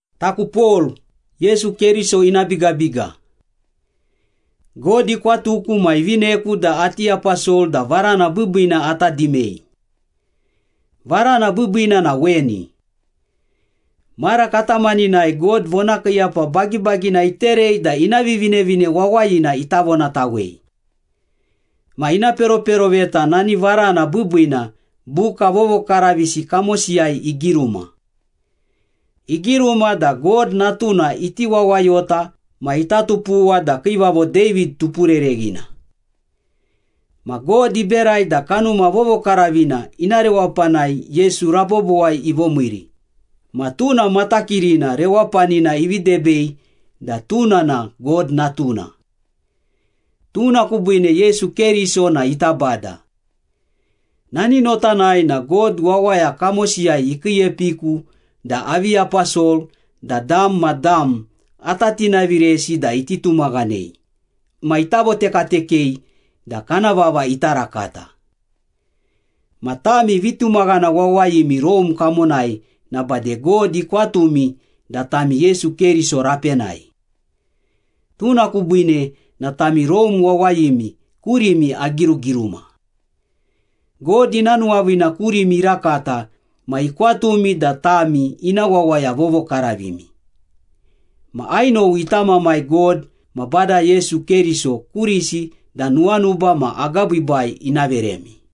Taku Pol, Yesu Keriso ina bigabiga. God ikwatuku ma ivineku da ati aposol da varana biibiina ata dimei. Varana biibiina na weni. Mara katamaninai God vonakiiyapa bagibagina iterei da ina Vivinevine Wawayina ita vonatawei. Ma ina peroperoveta nani varana biibiina buka vovokaravisi kamosiyai igiruma. Igiruma da God Natuna iti wawayota ma ita tupuwa da kiivavo David tupurereghina. Ma God iberai da Kanuma Vovokaravina ina rewapanai Yesu rabobowai ivomiiri, ma tuna matakirina rewapanina ivi debei da tuna na God Natuna. Tuna kubiine Yesu Keriso na ita Bada. Nani notanai na God wawaya kamosiyai ikiiepiku da avi aposol da dam ma dam ata tinaviresi da iti tumaghanei ma ita votekatekei da kana vava ita rakata. Ma tami vitumaghana wawayimi Rome kamonai na bade God ikwatumi da tami Yesu Keriso rapenai. Tuna kubiine na tami Rome wawayimi kurimi agirugiruma. God ina nuwaviina kurimi irakata ma ikwatumi da tami ina wawaya vovokaravimi. Ma ainowi ita Mamai God ma Bada Yesu Keriso kurisi da nuwanuba ma agabiibai ina veremi.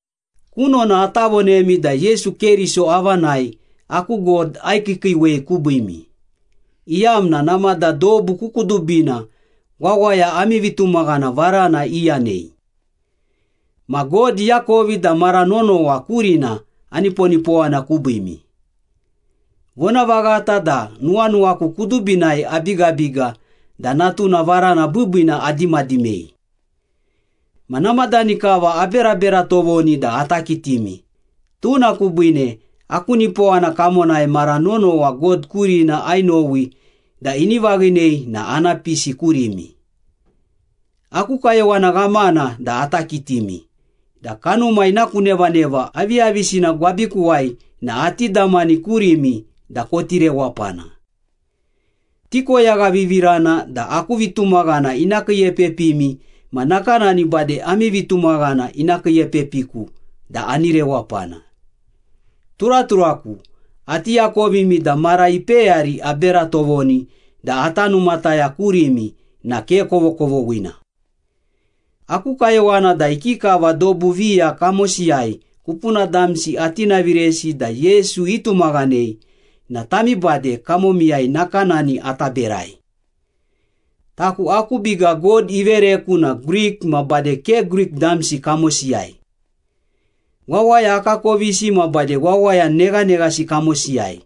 Kunona ata vonemi da Yesu Keriso avanai aku God aikiikiiwei kubiimi, iyamna namada dobu ku kudubina wawaya ami vitumaghana varana iyanei. Ma God iakovi da mara nonowa kurina aniponipowana kubiimi. Vonavaghata da nuwanuwaku kudubinai abigabiga da Natuna varana biibiina adimadimei. Ma namadani kava aberabera tovoni da ata kitimi, tuna kubiine aku nipowana kamonai mara nonowa God kurina ainowi da ini vaghinei na ana pisi kurimi. Aku kayowana ghamana da ata kitimi, da kanuma ina ku nevaneva aviyavisina gwabikuwai na ati damani kurimi da koti rewapana. Tikoyaghavivirana da aku vitumaghana ina kiiepepimi ma nakanani bade ami vitumaghana ina kiiepepiku da ani rewapana. Turaturaku, ati akovimi da mara ipeyari abera tovoni da ata numataya kurimi na ke kovokovoghina. Aku kayowana da ikikava dobu viya kamosiyai kupuna damsi atinaviresi da Yesu itumaghanei na tami bade kamomiyai nakanani ata berai. Taku aku biga God ivereku na Grik ma bade ke Grik damsi kamosiyai. Wawaya akakovisi ma bade wawaya neghaneghasi kamosiyai.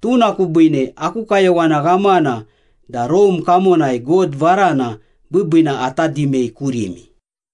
Tuna kubiine aku kayowana ghamana da Rome kamonai God varana biibiina ata dimei kurimi.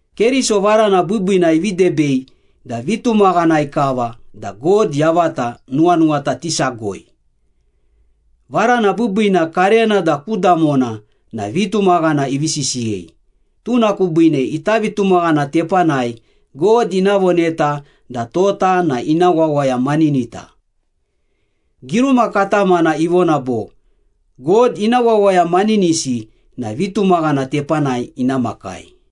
Keriso varana biibiina ivi debei da vitumaghanai kava da God yavata nuwanuwata tisagoi. Varana biibiina karena da ku damona na vitumaghana ivi sisiyei, tuna kubiine ita vitumaghana tepanai God ina voneta da tota na ina wawaya maninita. Giruma katamana ivona bo, “God ina wawaya maninisi na vitumaghana tepanai ina makai.”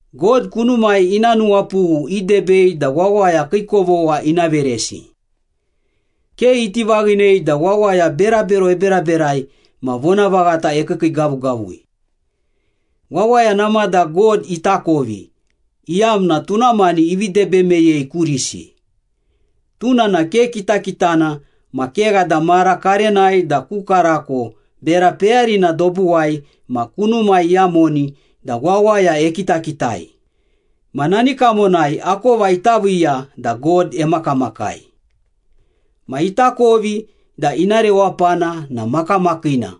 God kunumai ina nuwapughu idebei da wawaya kii kovogha ina veresi. Ke iti vaghinei da wawaya berabero eberaberai ma vonavaghata ekiikiigavugavui. Wawaya namada God itakovi, iyamna tuna mani ivi debe meyei kurisi. Tuna na ke kitakitana ma kegha da mara karenai da ku karako bera peyarina dobuwai ma kunumai iyamoni da wawaya ekitakitai, ma nani kamonai akova ita viiya da God emakamakai. Ma itakovi da ina rewapana na makamakiina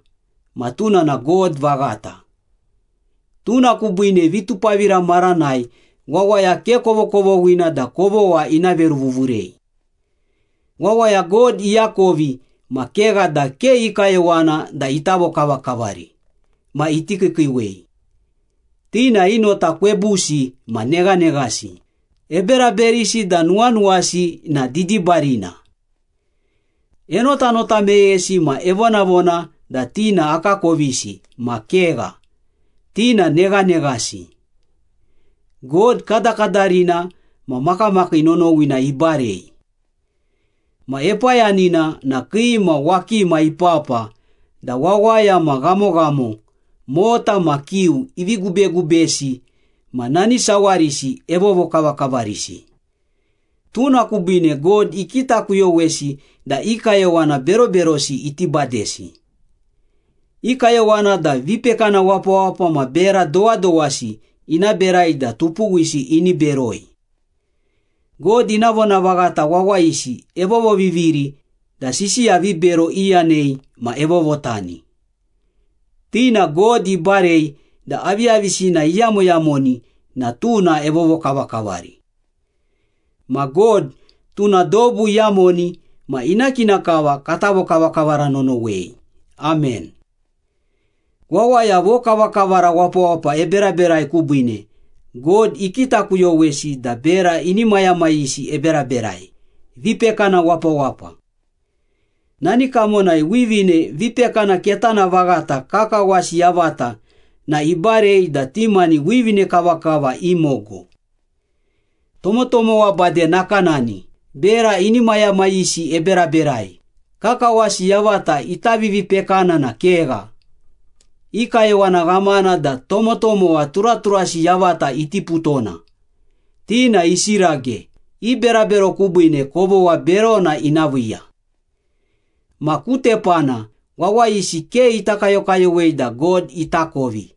ma tuna na God vaghata. Tuna kubiine vitupavira maranai wawaya ke kovokovoghina da kovogha ina veruvuvurei. Wawaya God iakovi ma kegha da ke i kayowana da ita vokavakavari ma iti kiikiiwei. Ti na i nota kwebusi ma neghaneghasi, eberaberisi da nuwanuwasi na didibarina. Enotanota meyesi ma evonavona da ti na akakovisi ma kegha, ti na neghaneghasi. God kadakadarina ma makamakii nonowina ibarei. Ma epayanina na kii ma wakima ipapa da wawaya ma ghamoghamo, mota ma kiu ivi gubegubesi ma nani sawarisi evovokavakavarisi. Tuna kubiine God ikitakuyowesi da i kayowana beroberosi iti badesi. I kayowana da vipekana wapawapa ma bera dowadowasi ina berai da tupuwisi ini beroi. God ina vonavaghata wawayisi evovoviviri da sisiya vibero iyanei ma evovotani. Ti na God ibarei da aviyavisina iyamoyamoni na tuna evovokavakavari. Ma God, tuna dobu iyamoni ma ina kina kava kata vokavakavara nonowei! Amen. Wawaya vokavakavara wapawapa eberaberai kubiine, God ikitakuyowesi da bera inimayamayisi eberaberai, vipekana wapawapa. Nani kamonai wivine vipekana ketana vaghata kakawasi yavata na ibarei da ti mani wivine kavakava imogo. Tomotomowa bade nakanani, bera inimayamayisi eberaberai, kakawasi yavata ita vivipekana na kegha. I kayowana ghamana da tomotomowa turaturasi yavata itiputona. Ti na isirage, i berabero kubiine kovogha berona ina viiya. Ma ku tepana, wawayisi ke ita kayokayowei da God itakovi,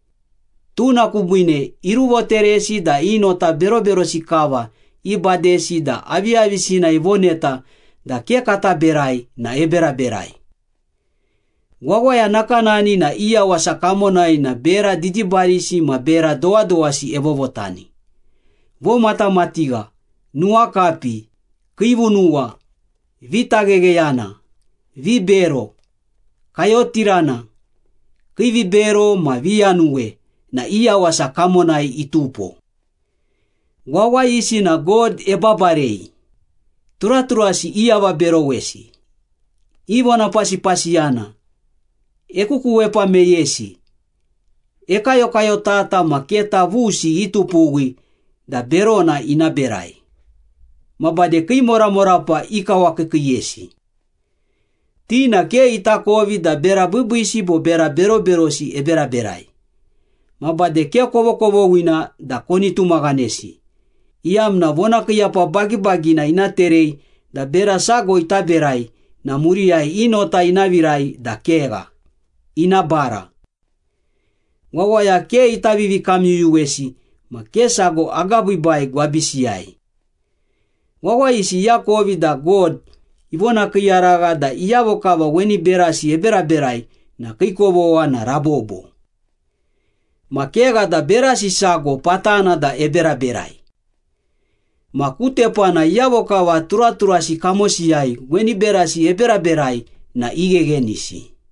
tuna kubiine iruvoteresi da i nota beroberosi kava ibadesi da aviyavisina ivoneta da ke kata berai na eberaberai. Wawaya nakanani na i yawasa kamonai na bera didibarisi ma bera dowadowasi evovotani. Vomatamatigha, nuwakapi, kiivunuwa, vitaghegheyana, vibero, kayotirana, kiivibero, ma viyanuwe na i yawasa kamonai itupo. Wawayisi na God ebabarei, turaturasi iavaberowesi, ivonapasipasiyana, ekukuwepa meyesi, ekayokayotata ma keta vusi itupuwi da berona ina berai, ma bade kii moramorapa ikawakiikiiyesi. Ti na ke itakovi da bera biibiisi bo bera beroberosi eberaberai. Ma bade ke kovokovoghina da koni tumaghanesi, iyamna vonakiiyapa bagibagina ina terei da bera sago ita berai na muriyai i nota ina virai da kegha, ina bara. Wawaya ke ita vivikamyuyuwesi ma ke sago agabiibai gwabisiyai. Wawayisi iakovi da God ivonakiiyaragha da iyavo kava weni berasi eberaberai na kii kovogha na rabobo. Ma kegha da berasi sago patana da eberaberai. Ma ku tepana iyavo kava turaturasi kamosiyai weni berasi eberaberai na igheghenisi.